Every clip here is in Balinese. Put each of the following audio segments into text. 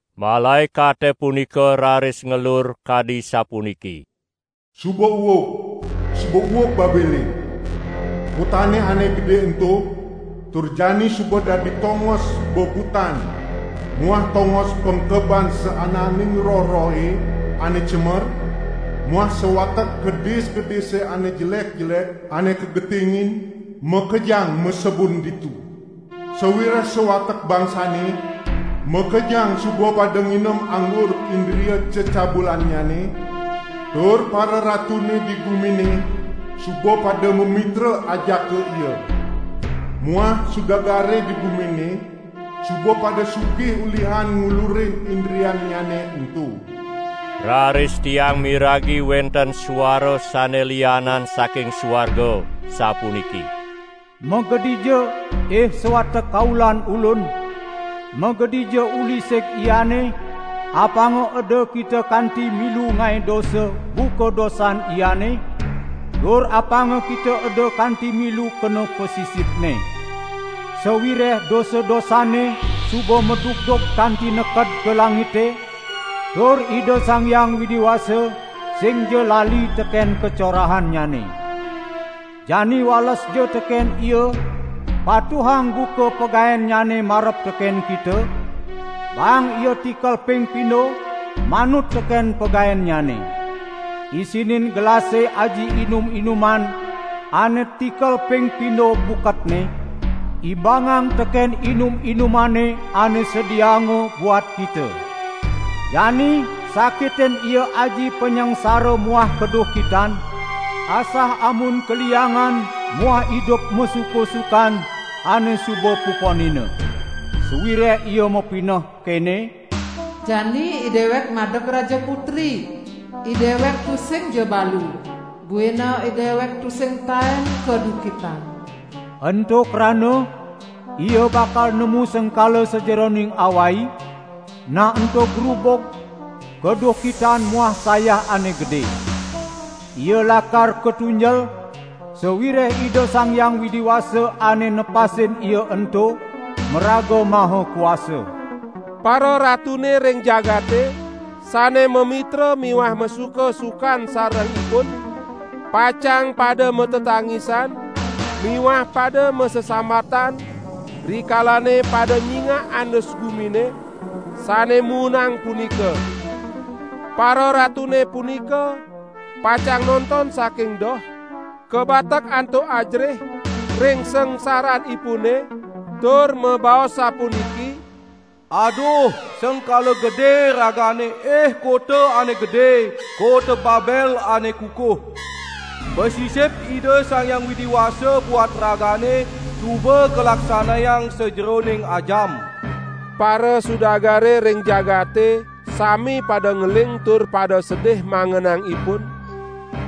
Malaekate punika raris ngelur kadi sapuniki: "Suba uug, suba uug Babele, kotane ane gede ento, tur jani suba dadi tongos bebutan muah tongos pengkeban saananing roh-rohe ane cemer, muah sawatek kedis-kedise ane jelek-jelek ane kagetingin, makejang masebun ditu. Sawireh sawatek bangsane makejang suba pada nginem anggur indria cecabulannyane, tur pararatune di gumine suba pada mamitra ajaka ia. Muah sudagare di gumine suba pada sugih ulihan ngulurin indriannyane ento." Raris tiang miragi wenten suara sane lianan saking suarga sapuniki: "Magedija, ih sawatek kaulan Ulun, magedija uli sig iane apanga eda kita kanti milu ngae dosa buka dosan iane, tur apanga kita eda kanti milu kena pasisipne. Sawireh dosa-dosanne suba madugdug kanti neked ka langite, tur Ida Sang Hyang Widi Wasa singja lali teken kacorahannyane. Jani walesja teken ia patuhang buka pagaennyane marep teken kita, baang ia tikel ping pindo manut teken pagaennyane. Isinin gelase aji inum-inuman ane tikel ping pindo buketne, imbangang teken inum-inumane ane sediaanga buat kita. Jani sakitin ia aji panyangsara muah kaduhkitan; asah amun kaliangan muah idup masuka-sukan ane suba puponina. Sawireh ia mapineh kene: 'Jani idewek madeg raja putri, idewek tusingja balu, buina idewek tusing taen kaduhkitan.' Ento krana ia bakal nemu sengkala sajeroning awai, nah ento grubug, kaduhkitan muah sayah ane gede. Ia lakar katunjel, sawireh Ida Sang Hyang Widi Wasa ane nepasin ia ento maraga maha kuasa." Pararatune ring jagate sane mamitra miwah masuka-sukan sarengipun, pacang pada matetangisan miwah pada masesambatan rikalane pada nyingak andus gumine sane muunang punika. Pararatune punika pacang nonton saking doh kabatek antuk ajerih ring sangsaranipune tur mabaos sapuniki: "Aduh, sengkala gede ragane ih kota ane gede, kota Babel ane kukuh. Pasisip Ida Sang Hyang Widi Wasa buat ragane suba kalaksanayang sajeroning ajam!" Parasudagare ring jagate sami pada ngeling tur pada sedih mangenang ipun,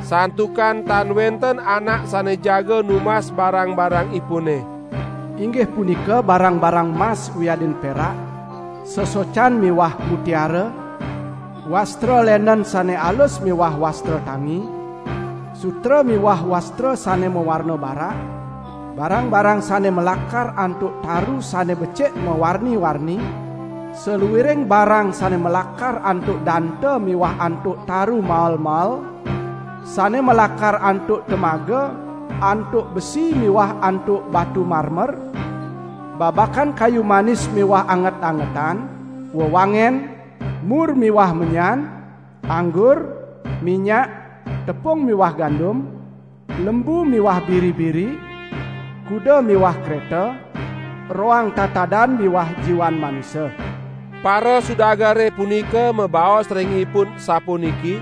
santukan tan wenten anak sane jaga numbas barang-barangipune. Inggih punika barang-barang mas wiadin perak, sesocan miwah mutiara, wastra lenen sane alus miwah wastra tangi, sutra miwah wastra sane mawarna barak, barang-barang sane malakar antuk taru sane becik mawarni-warni, saluiring barang sane malakar antuk danta miwah antuk taru mael-mael, sane malakar antuk temaga, antuk besi miwah antuk batu marmer, babakan kayu manis miwah anget-angetan, wewangen, mur miwah menyan; anggur, minyak, tepung miwah gandum; lembu miwah biri-biri; kuda miwah kreta; roang tatadan miwah jiwan manusa. Parasudagare punika mabaos ring ipun sapuniki: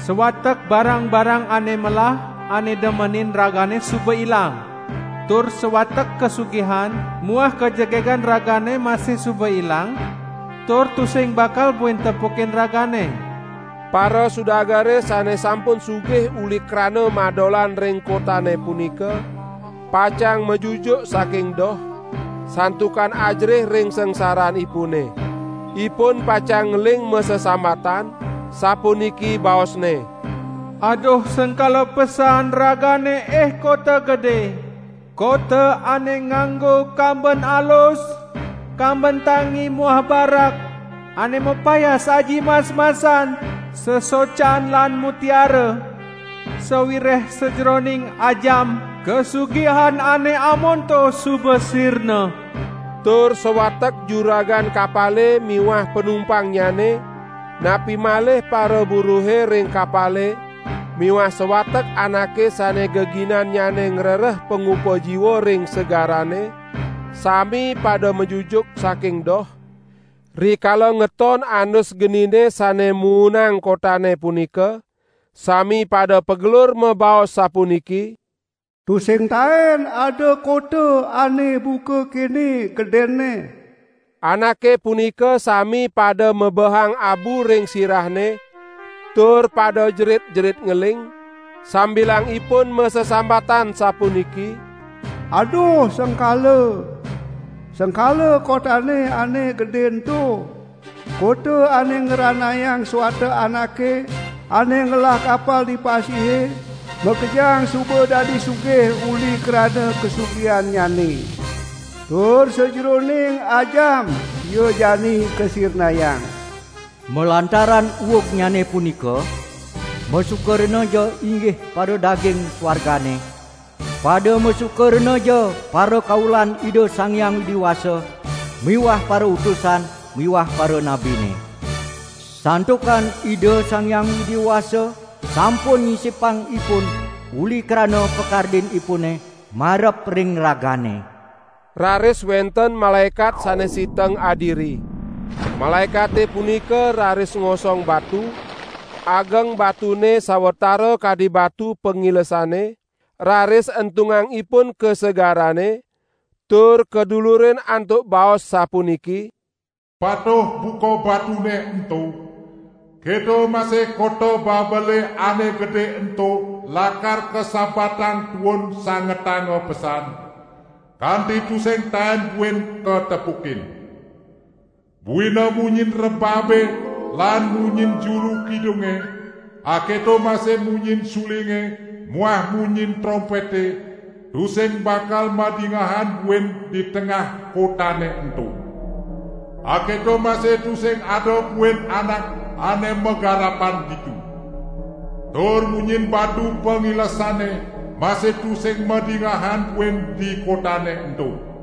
"Sawatek barang-barang ane melah ane demenin ragane suba ilang, tur sawatek kasugihan muah kajegegan ragane masih suba ilang, tur tusing bakal buin tepukin ragane!" Parasudagare sane sampun sugih uli krana madolan ring kotane punika, pacang majujuk saking doh, santukan ajerih ring sangsaranipune. Ipun pacang ngeling masesambatan sapuniki baosne: "Aduh sengkala pesan ragane ih kota gede, kota ane nganggo kamben alus, kamben tangi muah barak, ane mapayas aji mas-masan, sesocan lan mutiara! Sawireh sajeroning ajam kasugihan ane amonto suba sirna!" Tur sawatek juragan kapale miwah panumpangnyane, napi malih paraburuhe ring kapale miwah sawatek anake sane geginannyane ngrereh pangupa jiwa ring segarane, sami pada majujuk saking doh, rikala ngeton andus genine sane muunang kotane punika, sami pada pagelur mabaos sapuniki: "Tusing taen ada kota ane buka kene gedenne!" Anake punika sami pada mebehang abu ring sirahne tur pada jerit-jerit ngeling sambilang ipun masesambatan sapuniki: "Aduh, sengkala! Sengkala kotane ane gede ento, kota ane ngranayang sawatek anake ane ngelah kapal di pasihe makejang suba dadi sugih uli krana kasugihannyane. Tur sajeroning ajam ia jani kasirnayang!" Malantaran uugnyane punika, masuka renaja inggih paradaging suargane! Pada masuka renaja parakaulan Ida Sang Hyang Widi Wasa miwah parautusan miwah paranabine! Santukan Ida Sang Hyang Widi Wasa sampun nyisipang ipun uli krana pakardinipune marep ring ragane. Raris wenten malaekat sane siteng adiri. Malaekate punika raris ngosong batu, ageng batune sawatara kadi batu pangilesane, raris entung ipun ka segarane, tur kadulurin antuk baos sapuniki: "Patuh buka batune ento, keto masih kota Babele ane gede ento lakar kasabatang tuun sangetanga pesan, kanti tusing taen buin katepukin. Buina munyin rebabe lan munyin juru kidunge, aketo masih munyin sulinge muah munyin trompete tusing bakal madingehan buin di tengah kotane ento. Aketo masih tusing ada buin anak ane magarapan ditu. Tur munyin batu pangilesane masih tusing madingehan buin di kotane ento.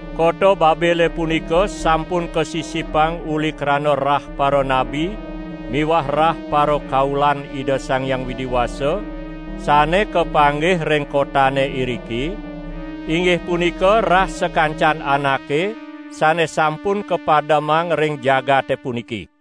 Kota Babele punika sampun kasisipang uli krana rah paranabi miwah rah parakaulan Ida Sang Hyang Widi Wasa sane kapanggih ring kotane iriki; inggih punika rah sakancan anake sane sampun kapademang ring jagate puniki.